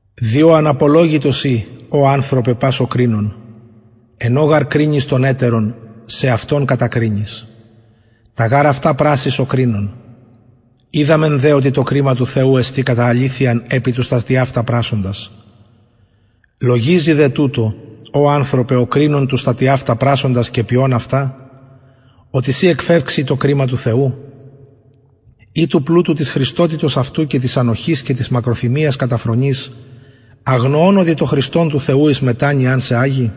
διο αναπολογητος ει ω ανθρωπε πας ο κρινων εν ω γαρ κρινεις τον ετερον σεαυτον κατακρινεις τα γαρ αυτα πρασσεις ο κρινων οιδαμεν δε οτι το κριμα του θεου εστιν κατα αληθειαν επι τους τα τοιαυτα πρασσοντας λογιζη δε τουτο ω ανθρωπε ο κρινων τους τα τοιαυτα πρασσοντας και ποιων αυτα οτι συ εκφευξη το κριμα του θεου η του πλουτου της χρηστοτητος αυτου και της ανοχης και της μακροθυμιας καταφρονεις αγνοων οτι το χρηστον του θεου εις μετανοιαν σε αγει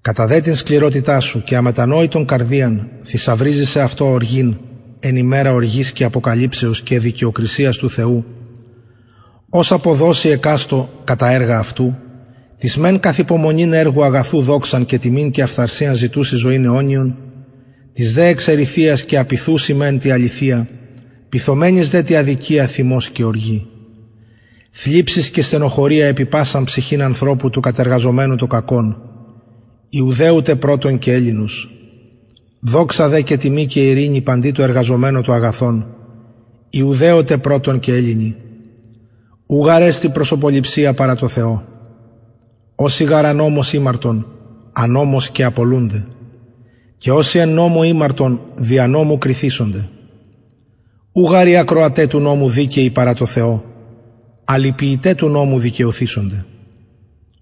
κατα δε την σκληροτητα σου και αμετανοητον καρδιαν θησαυριζεις σεαυτω οργην εν ημερα οργης και αποκαλυψεως και δικαιοκρισιας του θεου ος αποδωσει εκαστω κατα τα εργα αυτου τοις μεν καθ υπομονην εργου αγαθου δοξαν και τιμην και αφθαρσιαν ζητουσιν ζωην αιωνιον τοις δε εξ εριθειας και απειθουσιν μεν τη αληθεια πειθομενοις δε τη αδικια θυμος και οργη θλιψις και στενοχωρια επι πασαν ψυχην ανθρωπου του κατεργαζομενου το κακον ιουδαιου τε πρωτον και ελληνος δοξα δε και τιμη και ειρηνη παντι τω εργαζομενω το αγαθον ιουδαιω τε πρωτον και ελληνι ου γαρ εστιν προσωποληψια παρα τω θεω οσοι γαρ ανομως ημαρτον ανομως και απολουνται και οσοι εν νομω ημαρτον δια νομου κριθησονται ου γαρ οι ακροαται του νομου δικαιοι παρα τω θεω αλλ οι ποιηται του νομου δικαιωθησονται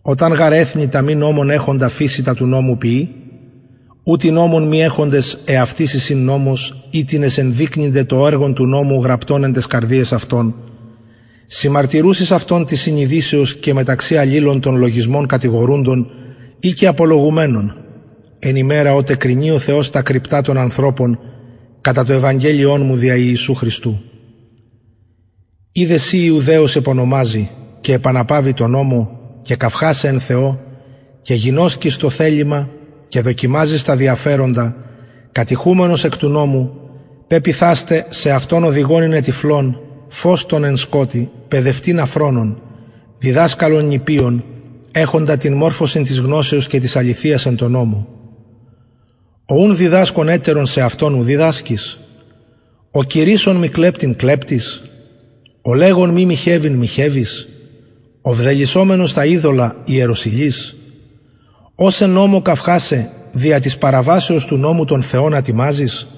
οταν γαρ εθνη τα μη νομον εχοντα φυσει τα του νομου ποιη ουτοι νομον μη εχοντες εαυτοις εισιν νομος οιτινες ενδεικνυνται το εργον του νομου γραπτον εν ταις καρδιαις αυτων συμμαρτυρουσης αυτων της συνειδησεως και μεταξυ αλληλων των λογισμων κατηγορουντων η και απολογουμενων εν ημερα οτε κρινει ο θεος τα κρυπτα των ανθρωπων κατα το ευαγγελιον μου δια ιησου χριστου ιδε συ ιουδαιος επονομαζη και επαναπαυη τω νομω και καυχασαι εν θεω και γινωσκεις το θελημα και δοκιμαζεις τα διαφεροντα κατηχουμενος εκ του νομου πεποιθας τε σεαυτον οδηγον ειναι τυφλων φως των εν σκοτει παιδευτην αφρονων διδασκαλον νηπιων εχοντα την μορφωσιν της γνωσεως και της αληθειας εν τω νομω ο ουν διδασκων ετερον σεαυτον ου διδασκεις ο κηρυσσων μη κλεπτειν κλεπτεις ο λεγων μη μοιχευειν μοιχευεις ο βδελυσσομενος τα ειδωλα ιεροσυλεις ος εν νομω καυχασαι δια της παραβασεως του νομου τον θεον ατιμαζεις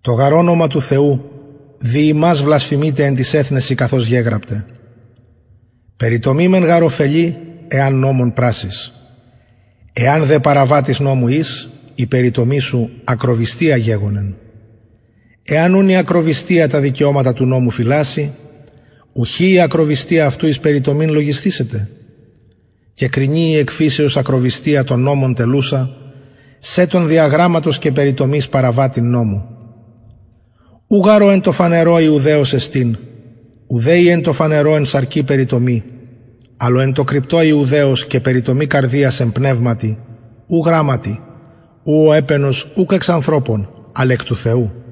το γαρ ονομα του θεου δι υμας βλασφημειται εν τοις εθνεσιν καθως γεγραπται περιτομη μεν γαρ ωφελει εαν νομον πρασσης εαν δε παραβατης νομου ης η περιτομη σου ακροβυστια γεγονεν εαν ουν η ακροβυστια τα δικαιωματα του νομου φυλασση ουχι η ακροβυστια αυτου εις περιτομην λογισθησεται και κρινει η εκ φυσεως ακροβυστια τον νομον τελουσα σε τον δια γραμματος και περιτομης παραβατην νομου ου γαρ ο εν τω φανερω ιουδαιος εστιν ουδε η εν τω φανερω εν σαρκι περιτομη αλλ ο εν τω κρυπτω ιουδαιος και περιτομη καρδιας εν πνευματι ου γραμματι ου ο επαινος ουκ εξ ανθρωπων αλλ εκ του θεου